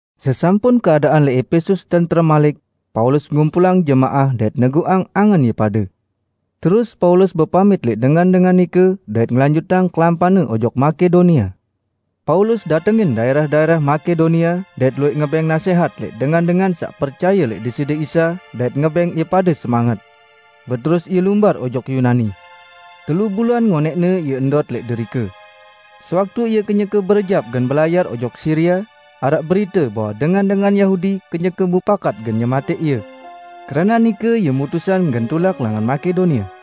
Sesampun keadaan lẽq Epesus tentrem malik, Paulus ngumpulang jemaah dait neguqang angen ie pade. Terus Paulus bepamit lẽq dengan-dengan nike, dait ngelanjutang kelampanne ojok Makedonia. Paulus datengin daẽrah-daẽrah Makedonia, dait luwẽq ngebẽng nasẽhat lẽq dengan-dengan saq percaye lẽq Deside Isa dait ngebẽng ie pade semanget. Beterus ie lumbar ojok Yunani. Telu bulan ngonẽqne ie ndot lẽq derike. Sewaktu ie kenyeke berejap gen belayar ojok Siria, araq berite bahwe dengan-dengan Yahudi kenyeke mupakat gen nyematẽq ie. Keranaq nike ie mutusang gen tulak langan Makedonia.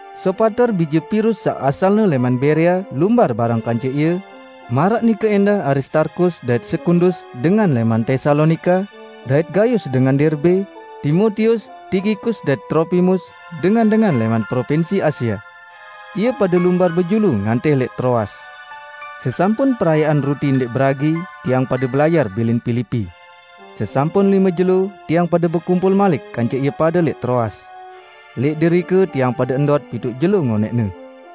Sopater bije Pirus saq asalne lẽman Berea lumbar bareng kance ie; maraq nike ẽndah Aristarkus dait Sekundus dengan lẽman Tesalonika, dait Gayus dengan Derbe, Timotius, Tikikus dait Tropimus, dengan-dengan lẽman propinsi Asia. Ie pade lumbar bejulu ngantih lẽq Troas. Sesampun Perayaan Ruti Ndẽq Beragi, tiang pade belayar bilin Pilipi. Sesampun lime jelo, tiang pade bekumpul malik kance ie pade lẽq Troas. Lẽq derike tiang pade ndot pituq jelo ngonẽqne.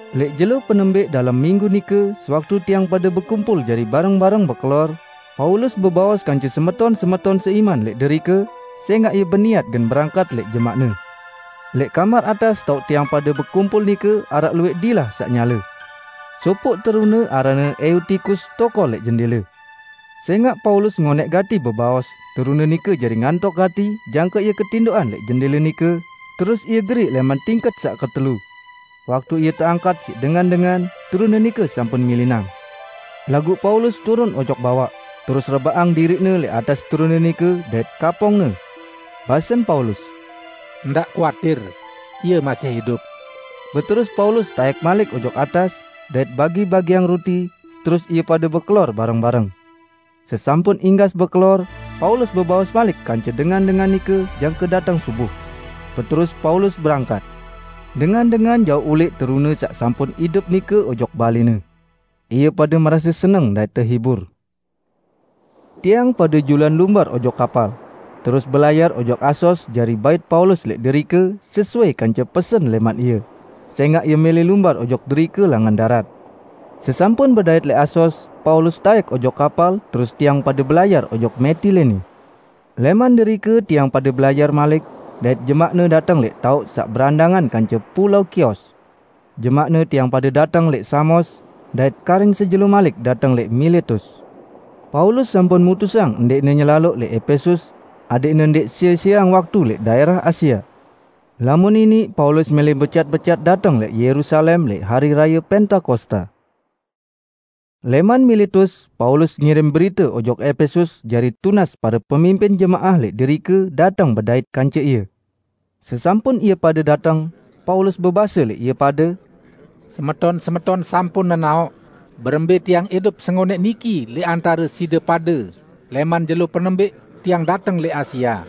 Lẽq jelo penembẽq dalem minggu nike, sewaktu tiang pade bekumpul jari bareng-bareng bekelor, Paulus bebaos kance semeton-semeton seiman lẽq derike, sẽngaq ie beniat gen berangkat lẽq jemaqne. Lẽq kamar atas taoq tiang pade bekumpul nike araq luwẽq dilah saq nyale. Sopoq terune aranne Eutikus tokol lẽq jendẽle. Sẽngaq Paulus ngonẽq gati bebaos, terune nike jari ngantok gati jangke ie ketindoqan lẽq jendẽle nike, terus ie geriq lẽman tingket saq ketelu. Waktu ie teangkat siq dengan-dengan, terune nike sampun milinang. Laguq Paulus turun ojok bawaq, terus rebaqang diriqne lẽq atas terune nike dait kapongne. Basen Paulus, "Ndaq kuatir, ie masih idup!" Beterus Paulus taẽk malik ojok atas, dait bagi-bagiang ruti, terus ie pade bekelor bareng-bareng. Sesampun inggas bekelor, Paulus bebaos malik kance dengan-dengan nike jangke dateng subuh. Beterus Paulus berangkat. Dengan-dengan jauq ulẽq terune saq sampun idup nike ojok balẽne. Ie pade merase seneng dait tehibur. Tiang pade juluan lumbar ojok kapal, terus belayar ojok Asos jari bait Paulus lẽq derike sesuai kance pesen lẽman ie, sẽngaq ie mẽlẽ lumbar ojok derike langan darat. Sesampun bedait lẽq Asos, Paulus taẽk ojok kapal terus tiang pade belayar ojok Metilene. Lẽman derike tiang pade belayar malik, dait jemaqne dateng lẽq taoq saq berandangan kance pulao Kios. Jemaqne tiang pade dateng lẽq Samos, dait karing sejelo malik dateng lẽq Miletus. Paulus sampun mutusang ndẽqne nyelaloq lẽq Epesus, adẽqne ndẽq sie-sieang waktu lẽq daẽrah Asia. Lamun iniq Paulus mẽlẽ becat-becat dateng lẽq Yerusalem lẽq Hari Raye Pentakosta. Lẽman Miletus Paulus ngirim berite ojok Epesus jari tunas pare pemimpin jemaah lẽq derike dateng bedait kance ie. Sesampun ie pade dateng, Paulus bebase lẽq ie pade, "Semeton-semeton sampun nenaoq berembẽ tiang idup sengonẽq niki lẽq antare side pade lẽman jelo penembẽq tiang dateng lẽq Asia.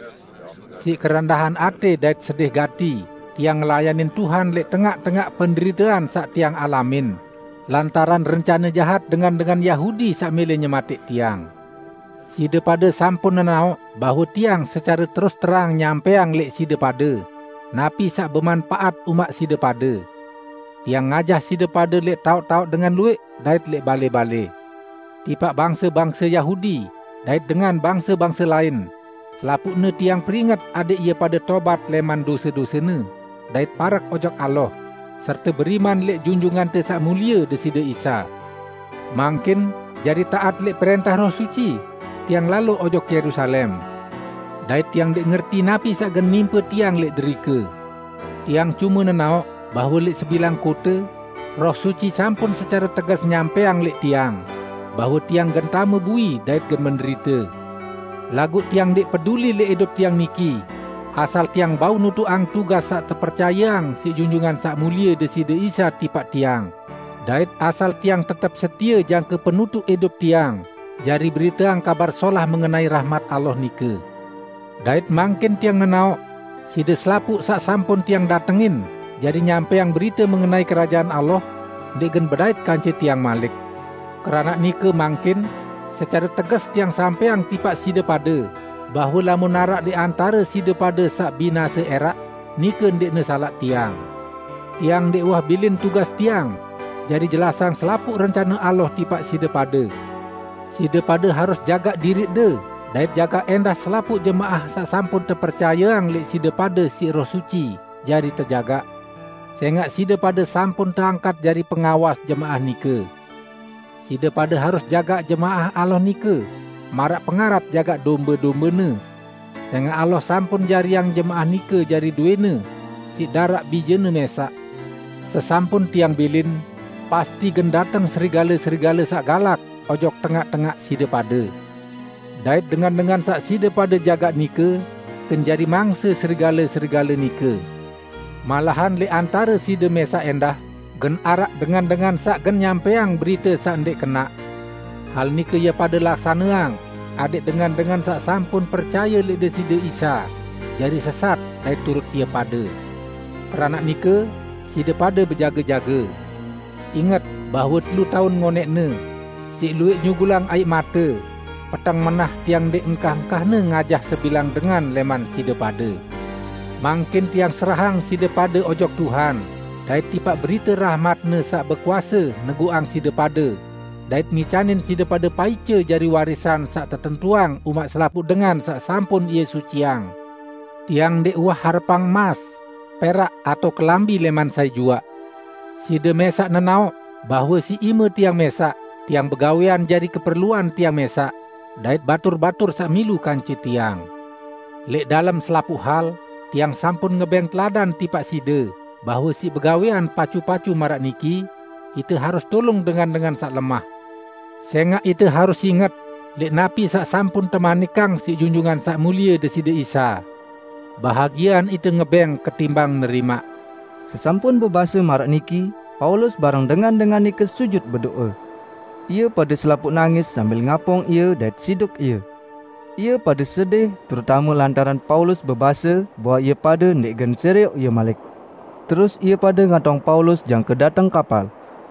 Siq kerendahan atẽ dait sedih gati, tiang ngelayanin Tuhan lẽq tengaq-tengaq penderitean saq tiang alamin lantaran rencane jahat dengan-dengan Yahudi saq mẽlẽ nyematẽq tiang. Side pade sampun nenaoq bahwe tiang secare terus-terang nyampẽang lẽq side pade napi saq bemanpaat umaq side pade. Tiang ngajah side pade lẽq taoq-taoq dengan luwẽq dait lẽq balẽ-balẽ. Tipaq bangse-bangse Yahudi dait dengan bangse-bangse lain, selapuqne tiang peringet adẽq ie pade tobat lẽman dose-dosene dait parek ojok Allah, serte beriman lẽq Junjungante Saq Mulie Deside Isa. Mangkin jari taat lẽq prẽntah Roh Suci, tiang lalo ojok Yerusalem. Dait tiang ndẽq ngerti napi saq gen nimpe tiang lẽq derike. Tiang cume nenaoq bahwe lẽq sebilang kote, Roh Suci sampun secare teges nyampẽang lẽq tiang, bahwe tiang gen tame bui dait gen menderite. Laguq tiang ndẽq peduli lẽq idup tiang niki, asal tiang bau nutuqang tugas saq tepercayeang siq Junjungan Saq Mulie Deside Isa tipaq tiang dait asal tiang tetep setie jangke penutuq idup tiang jari beriteang Kabar Solah mengenai rahmat Allah nike. Dait mangkin tiang nenaoq, side selapuq saq sampun tiang datengin jari nyampẽang berite mengenai Kerajaan Allah, ndẽq gen bedait kance tiang malik. Keranaq nike mangkin secare teges tiang sampẽang tipaq side pade bahwe lamun araq lẽq antare side pade saq binase ẽraq, nike ndẽqne salaq tiang. Tiang ndẽq uwah bilin tugas tiang jari jelasang selapuq rencane Allah tipaq side pade. Side pade harus jagaq diriqde dait jagaq ẽndah selapuq jemaah saq sampun tepercayeang lẽq side pade siq Roh Suci jari tejagaq; sẽngaq side pade sampun teangkat jari pengawas jemaah nike. Side pade harus jagaq jemaah Allah nike maraq pengarat jagaq dombe-dombene, sẽngaq Allah sampun jariang jemaah nike jari dowẽ-Ne siq daraq Bije-Ne mẽsaq. Sesampun tiang bilin, pasti gen dateng serigale-serigale saq galak ojok tengaq-tengaq side pade. Dait dengan-dengan saq side pade jagaq nike gen jari mangse serigale-serigale nike. Malahan lẽq antare side mẽsaq ẽndah gen araq dengan-dengan saq gen nyampẽang berite saq ndẽq kenaq. Hal nike ie pade laksaneang adẽq dengan-dengan saq sampun percaye lẽq Deside Isa jari sesat dait turut ie pade. Keranaq nike, side pade bejage-jage! Inget bahwe telu taun ngonẽqne, siq luwẽq nyugulang aiq mate, peteng menah, tiang ndẽq engkah-engkahne ngajah sebilang dengan lẽman side pade. Mangkin tiang serahang side pade ojok Tuhan dait tipaq berite rahmat-Ne saq bekuase neguqang side pade dait ngicanin side pade paice jari warisan saq tetentuang umaq selapuq dengan saq sampun Ie suciang. Tiang ndẽq uwah harepang emas, perak atao kelambi lẽman sai juaq. Side mẽsaq nenaoq bahwe siq ime tiang mẽsaq tiang begawẽan jari keperluan tiang mẽsaq dait batur-batur saq milu kance tiang. Lẽq dalem selapuq hal tiang sampun ngebẽng teladan tipaq side bahwe siq begawẽan pacu-pacu maraq niki, ite harus tulung dengan-dengan saq lemah. Sẽngaq ite harus inget lẽq napi saq sampun temanikang Junjungan Saq Mulie Deside Isa, 'Bahagiean ite ngebẽng ketimbang nerimaq.' " Sesampun bebase maraq niki, Paulus bareng dengan-dengan nike sujut bedo'e. Ie pade selapuq nangis sambil ngapong ie dait siduk ie. Ie pade sedih terutame lantaran Paulus bebase bahwe ie pade ndẽq gen serioq ie malik. Terus ie pade ngatong Paulus jangke dateng kapal.